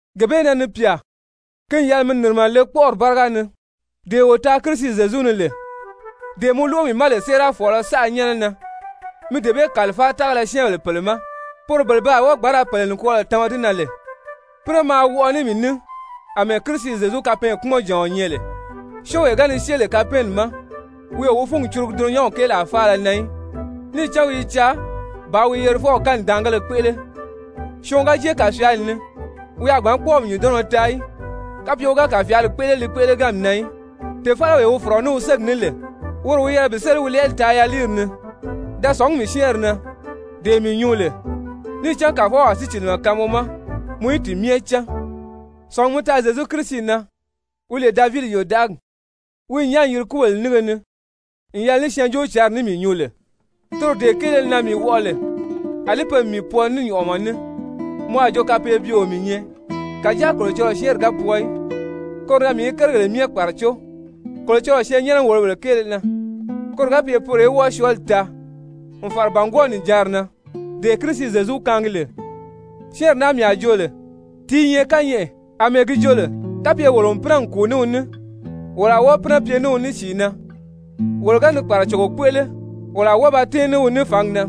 Gee bee na, ni pyà, ki n yɛlɛ mi nìrimɛ le kpɔ́ʔɔri báriga ni, dee wo taa Kirisi Zyezu ni lè. Dee mɔ lóʔo mii ma lè séerafɔɔlɔ saʔa nyɛ́nɛ na, mi dee bee kàlifáa tágala syɛ́ɛnbèle pèle ma, poro bele pe a wɔ́ɔ gbǎn ra pèle nikwɔɔlɔ tama di na lè. Pínɛ maa wɔʔɔ ní mii ní àmɛɛ Kirisi Zyezu kapɛɛnkpumɔnjàɔn nyɛ lè. Syɔ́ɔnwee ga ni syée lè kapɛɛnni ma, wi o wi fúngi curugu dulunyanw kéelaa faala na í, níì cán wi i caa bàā wi yerifɔw kanidaangéle kpéʔele, syɔɔn ga jée kàfyaali ni, wi a gbǎn kpɔ́ɔmi nyùndɔnnɔ taa í, kapye wi ga kàfyaali kpéʔele li kpéʔeleganmi na í. Tèfalawee wi fɔ̀rɔ ní wi ségi ní lè, woro wi yɛlɛ bi séli wi lɛɛli taa yaliiri ni. Da sɔ̀ngí mii syɛ́ɛnri na, dee mii nyuu lè. Níì cán Kàfɔw a sícilimɛ kaan mɔ ma mɔ í ti myɛ cán. Sɔ̀ngi mi taa Zyezu Kirisi na wi lè Davidi yòdaʔagi, wi n nyán n yiri kúbèle nínge ni n yɛlɛ ní Syɛɛnjóocǎnri ní mii nyuu lè, toro dee kéele na mii wɔʔɔ lè àlí pe n mii pwɔɔ ní nyɔ̀ʔɔmɔ ní, mɔ a jo kapeebyeo mii nyɛ. Kàjáa Kolocɔlɔɔ syɛ́ɛnri ga pwɔɔ í. Koro na mii i kérigèle myɛ kpàracó Kolocɔlɔɔ syɛɛnnyɛnɛ-wòlobèle kéele na, koro ga pye poro í wɔ́ɔ syɔɔli taa, n fàra bàngwɔɔ nìjanri na, dee Kirisi Zyezu kaangi lè. Syɛ́ɛnri naa mii a joo lè, ti i nyɛ kányɛʔɛ, àmɛɛ gi jo lè: «Kapye wolo n pínɛ n kùu ní wi ní, wolo a wɔ́ɔ pínɛ pye ní wi ní sìi na. Wolo ga ni kpàracogo kpéʔele, wolo a wɔ́ɔ ba tɛ́ɛn ní wi ní fǎngi na.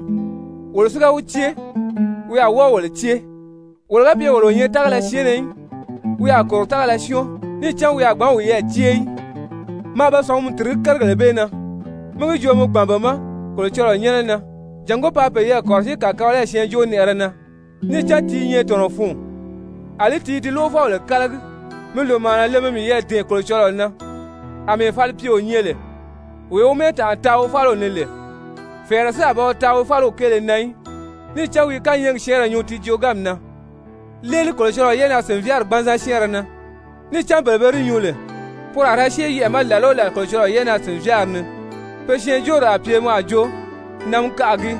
Wolo si ga wi cée, wi a wɔ́ɔ wolo cée. Wolo ga pye wolo o nyɛ tágala syɛɛnnɛ í, wi a kòro tágala syɔ́ɔn, níì cán wi a gbǎn wiyɛɛ cée í.» Maa be sɔ̀ngumi tìrigí kérigèle bee na, mi gi joo mi gbàn be ma Kolocɔlɔɔ nyɛ́nɛ na jàngó paa peyɛɛ kɔ̀rɔsíi kàkabalayi syɛɛnjóonɛʔɛrɛ na, níì cán ti i nyɛ tɔ̀nɔ fun, àlí ti i di lóʔofɔbèle kálagi. Mi lòmaana le, mi miyɛɛ dɛ̀ɛn Kolocɔlɔɔ na àmɛɛ falipyeo nyɛ lè, wee wi mɛ́ɛtanʔa taa wi fáliw ni lè, fɛ̀ɛrɛ si a ba wi taa wi fáliw kéele na í, níì cán wi i kányɛɛgi syɛ́ɛnrɛ nyuu ti jooganmi na. Léeli Kolocɔlɔɔ yɛ́ʔɛnaa-sìnvyaari gbanzan syɛ́ɛnrɛ na, níì cán bele be di nyuu lè, poro a ra syée yɛʔɛ̀ ma làla o làla Kolocɔlɔɔ yɛ́ʔɛnaa-sìnvyaari ni. Pe syɛɛnjóori a pye mɔ a jo namikaʔa gii.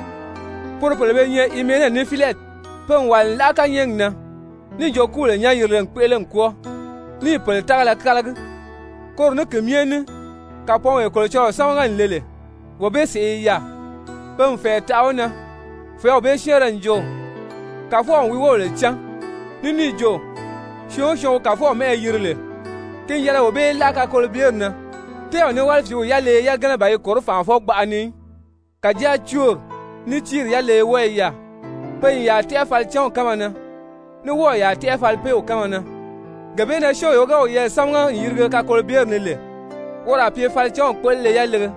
Poro pèle be nyɛ Himene ní Filɛti. Pe n wàli n láʔa kányɛɛgi na níì jo kúbèle nyán-yirile n kpéʔele n kwɔ́ɔ, níì pèle tágala kálagi. Koro ní ki myɛ ní kàpɔɔnwee Kolocɔlɔɔ sámaga n le lè, wee bee sèʔé i yaà. Pe n fɛ̀ɛ taʔa wi na. Fɛ̀ɛ́w bee syɛ́ɛnrɛ n jo: «Kàfɔw n wi wóbèle cán,» ní níì jo: «Syɔɔn o syɔɔn wi Kàfɔw mɛ́ʔɛ yiri lè, ki n yɛlɛ wee bee í láʔa kakolobyeri na.» Tɛ́ɛw ní wálifiiw yaleye yagana ban yi kòró fànʔafɔ-gbaʔa ni í, kàjáa cóori ní tíiri yaleye wɔ́ɔ i yaà. Pe n yàa tɛ́ʔɛ falicanw kánma na, ní wɔ́ɔ̀ yàa tɛ́ʔɛ falipeew kánma na. Gee bee na syɔ́ɔnwee ga wiyɛɛ sámaga n yirige kakolobyeri ni lè, woro a pye falicanw kpéʔelele yalege,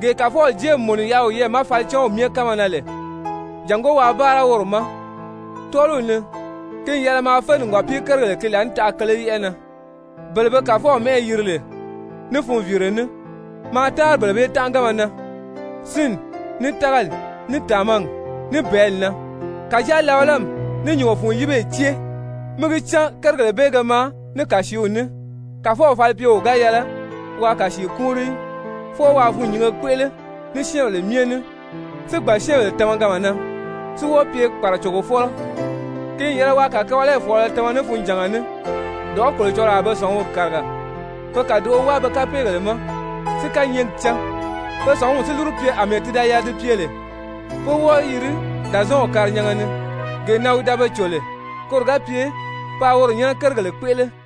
gee Kàfɔw jée n mùnu n yaʔa wiyɛɛ ma falicanw myɛ kánma na lè, jàngó waa báara woro ma. Tɔ́ɔliw ni ki n yɛlɛ maa fé nìgɔpii-kérigèle ki laànitaʔa kele yɛ́ʔɛ na, bele be Kàfɔw mɛ́ʔɛ yiri lè ní funviire ní, maa táanri bele bee tánʔaganma na, sínni, ní tágali, ní tàmagi, ní bɛ̀ɛ́li na. Kàjáa labalami ní nyùngo fun yíbeyi cée, mí gi cán kérigèle bee ge maa ní kàsiiw ní. Kàfɔw falipyeo ga yɛlɛ waa kàsii kúunri í. Fwɔɔ waa fûnnyinge kpéʔele ní syɛ́ɛnbèle myɛ ní, si gbàn syɛ́ɛnbèle tamaganma na, si wɔ́ɔ pye kpàracogofɔlɔ. Ki n yɛlɛ waa kàkabalayi fɔ̀ɔlɔ tama ní funjànga ní, dɔ̀ʔɔ́ Kolocɔlɔɔ a be sɔ̀nguri kàriga, pe kàdoʔo wáa pe kapeegèle ma si kányɛɛgi cán, pe sɔ̀nguri si lúru pye àmɛɛ ti da yɛlɛ di pye lè, pé wɔ́ɔ yiri Dàzɔɔnw karinyanga ni gee na wi da be cò lè koro ga pye paa woro nyɛ́nɛ kérigèle kpéʔele.